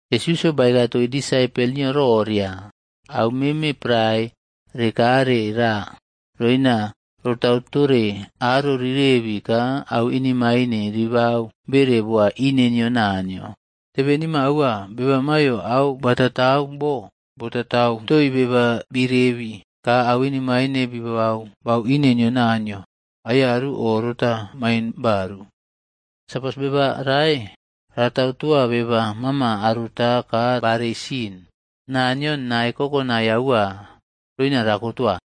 Yesusꞌyo baeka toii disaipol nio roria, “Au meme prae rekare ra roina rotau tore aro rirebi ka au inemaine ribau bere boa ine nio Naniyo. Tebenima aua, beba maiyo au batatau bo botatau toii beba birebi ka au inemaine bibaba bau ine nio Naniyo, aiyaru o rota main baru. Sapos beba rae ratau toa beba mama aruta ka barei sin, Naniyo nae kokonai aua roina rakotoa.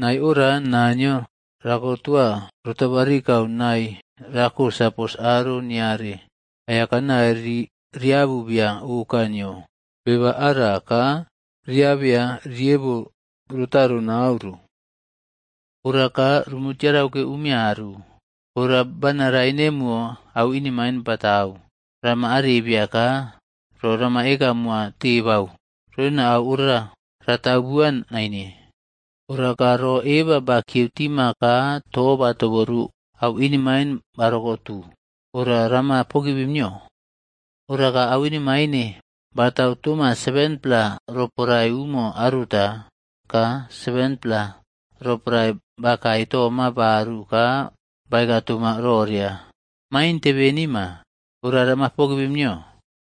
Nae ora Naniyo rakotoa rotabarikau nae rako sapos aro niare aiyakanai riabu bia oka nio beba ara ka riabeya riebo rotaro nau ro. “Ora ka rumu tiarau ke umiaru. “Ora bana rae nemo au inemaine batau, rama arebiya ka ro rama eka moa tebau roina au ora ratau bua naine. Ora ka ro eba bakiyeu tima ka to batoboru au inemain barokotu, ora rama pogivim nio. Ora ka au inemaine batau toma 7-pla roporae umo aruta, ka 7-pla roporae bakae toma baru ka baeka toma roria, ‘Main tebenima,’ ora rama pogivim nio.”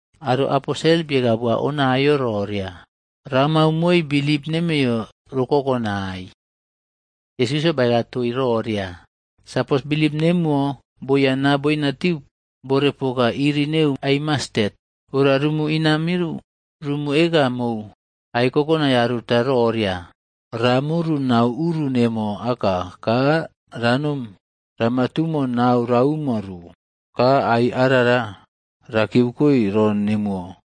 Aro Aposel bieka boa Onaiꞌyo roria, “Ramau moi bilip nemeiyo ro kokonai.” Yesusꞌyo baeka toii roria, “Sapos bilip nemuwo boyana boina timu bore poka iri neu ai mastet, ora rumu inamiu rumu eka mou ai kokonai aruta roria, ‘Ra muru nau uru nemo aka ka ranom rama tumo nau ranomu ro.’ Ka ai arara ra kiyeukoi ro nemuwo.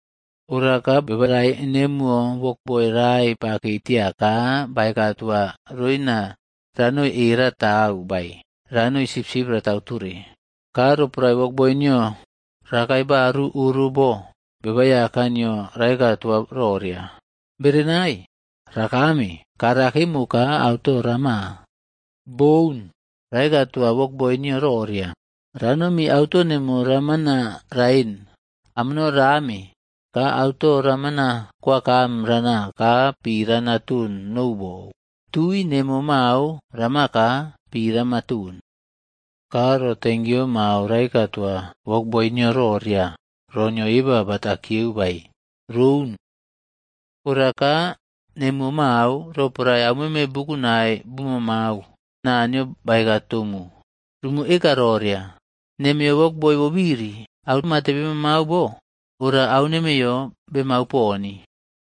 “Ora ka Beba rae nemuwo wokboi rae bakei tia ka baeka toa roina ranoi e ratau bae ranoi sipsip ratau tore. Ka roporae wokboi nio rakae baru oro bo, Beba Aiyaka nio raeka toa roria, ‘Berenai, rakame ka ra kemo ka auto rama?’ Boun. Raeka toa wokboi nio roria, ‘Ranomi auto neno ramana raen amono rame ka auto ramana kwakame rana ka pi rana ton nou bou, tui nemo mao rama ka pi rama ton.’ Ka ro tenkiyo mao raeka toa wokboi nio roria ro nio eba bata kiyeu bae? Roun. Ora ka nemuwo mao, roporae aumeme bukunai bumaꞌmau Naniyo baeka tomu, rumu eka roria, ‘Nemeiyo wokboi bobiri. Au mate bemaꞌmau bo, ora au nemeiyo bemau poni.’”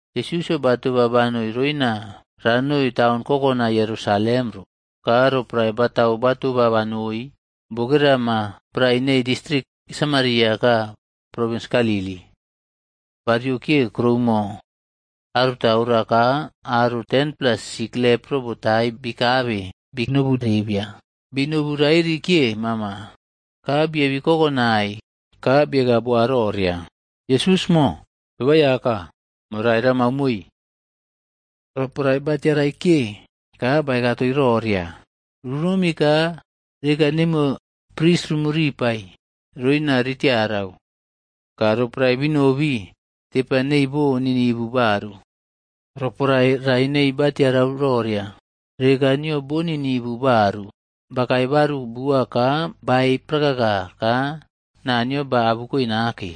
Yesusꞌyo batoba banoi roina ranoi taun kokonai Yerusalem ro. Ka roporae batau batoba banoi, bokera ma prae neii distrik Sameria ka provins Galili. Bariokiye kuroumo aruta orara ka aro 10-pla sik lepro botai bikabe bi nobu bia. Bi nobu rairi kiye mama, ka biebi kokonaia ka bieka boa roria, “Yesusꞌmo, Beba Aiyaka, morai ramau moi.” Roporae ba tiarai kiye ka baeka toii roria, “Runomi ka reka nemuwo pris rumu ripaib roina ritiarau.” Ka roporae binobi, tepa nei bo ninivu baru. Roporae rae neii batiarau roria, reka nio bo ninivu baru, bakae baru bua ka baei prakaka ka naa nio Naniyo ba abukoe nake.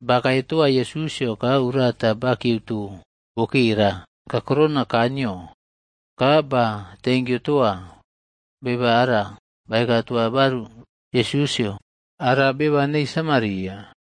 Bakae toa Yesusꞌyo ka urata bakieuto bokera kakurou kaa nio, ka ba tenkiu toa. Beba ara bakae toa baru Yesusꞌyo, ara beba neu Samaria.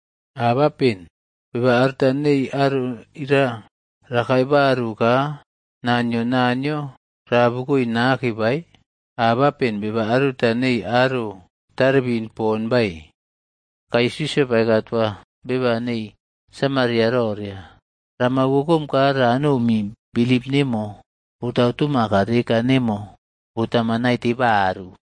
Abapen beba aruta nei aro ira rakae baru ka naa nio Naniyo raꞌabukoe nake bae? Abapen beba aruta neii aro tarebin pon bae?” Ka Yesusꞌyo baeka toa beba nei Samaria roria, “Rama wokom ka ranomi, bilip nemo botau toma ka reka nemo botama naite baru.”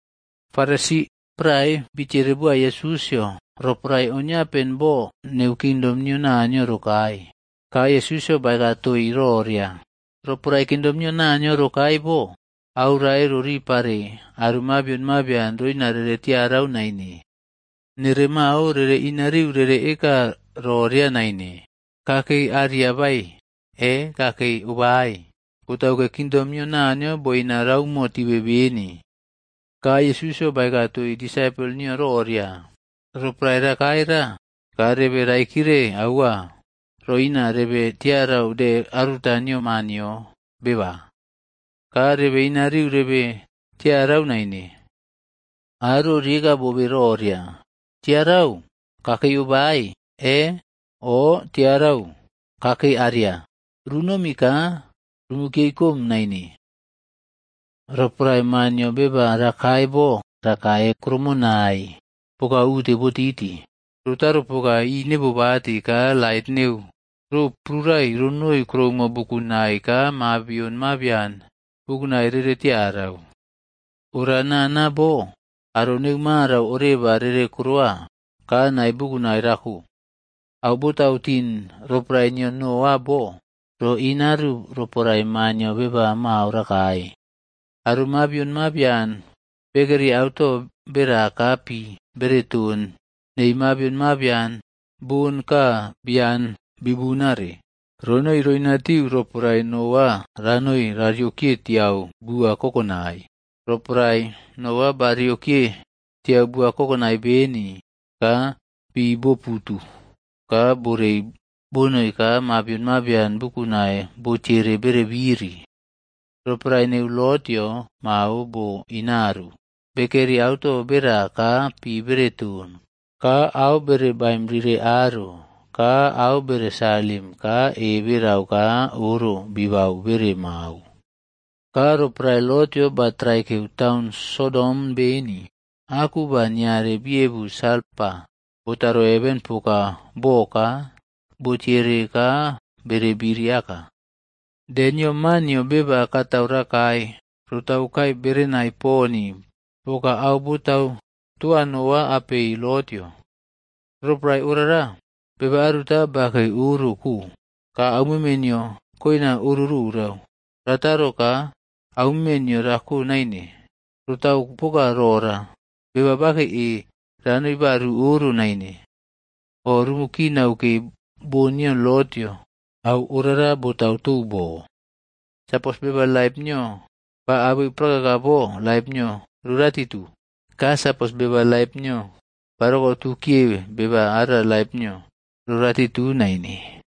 Farisi prae bitiere boa Yesusꞌyo roporae oniapen bo neu Kingdom nio Naniyo rokae, ka Yesusꞌyo baeka toii roria, “Roporae kingdom nio Naniyo rokae bo, au rae roripare aro mabion mabian roina rere tiarau naine. Nere mao rere inariu rere eka roria naine, ‘Kakei aria bae’ e ‘Kakei obae.’ Botauke kingdom nio Naniyo boina raumo tibe beni.” Ka Yesusꞌyo baeka toii disaipol nio roria, “Roporae rokae ra ka rebe raikire aua roina rebe tiarau de aruta nio Maa nio Beba. Ka rebe inariu rebe tiarau naine. Aro rieka bobe roria, ‘Tiarau, Kakei obae bae e,’ o ‘Tiarau, kakei aria.’ Runomi ka rumu kiyeikome naine. Roporae Maa nio Beba rakae bo rakae krumunai poka ute rotiti rotau poka ineꞌbobati ka lait neu ro prurai ronoi kuroumo bukunai ka mabion mabian bukunai rere tiarau. Ora nana bo aro neu marau oreba rere korowa, ka nae bukunai rako. “Au botau tin roporae nio Noaꞌoc bo, roinaru roporae Maa nio Beba mao rakae. Aro mabion mabian bekeri auto bera ka pi bere ton nei mabian mabion bon ka bian bi bunare ronoi roinatiu roporae Noaꞌo ranoi rariokiye tiau bua kokonai. Roporae Noa bariokiye tiau bua kokonai beni, ka pi bo putu ka borei bonoi ka mabion mabian bukunai botiyere bere biri. “Roporae neu Lotꞌyod mao bo boinaru. Bekeri auto bera ka pi bere ton, ka au bere baim rire aro, ka au bere salim ka e berau ka oro bibau bere mao. Ka roporae Lotꞌyo ba traikeu taun Sodom beni, aku ba niare bi ebu salfa botaro heven poka bo ka botiere ka bere biri aka. “De nio Maa nio beba katau rakae rotaukae berenai poni poka au botau toa Noaꞌo apei Lotꞌyo. Roporae orara, beba aruta bakei oro ko,e ka aumeme nio koina oro rorau, rataro ka aumeme nio rako naine. Rotau poka rora, beba bakei e ranoi baru oro naine. O rumu kinau ke bon nio Lotꞌyo, au orara botau tou bo. Sapos beba laip nio ba abeu prakaka bo laip nio roratitu. Ka sapos beba laip nio barokotu kiye beba ara laip nio roratitu naine.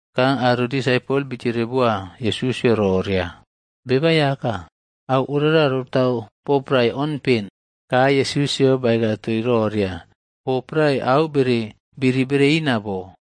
Ka aro disaipol bitiere boa Yesusꞌyo roria, “Beba Aiyaka, au ora rotau bo prae onpen?” Ka Yesusꞌyo baeka toii roria, “Bo prae au bere biri bereina bo,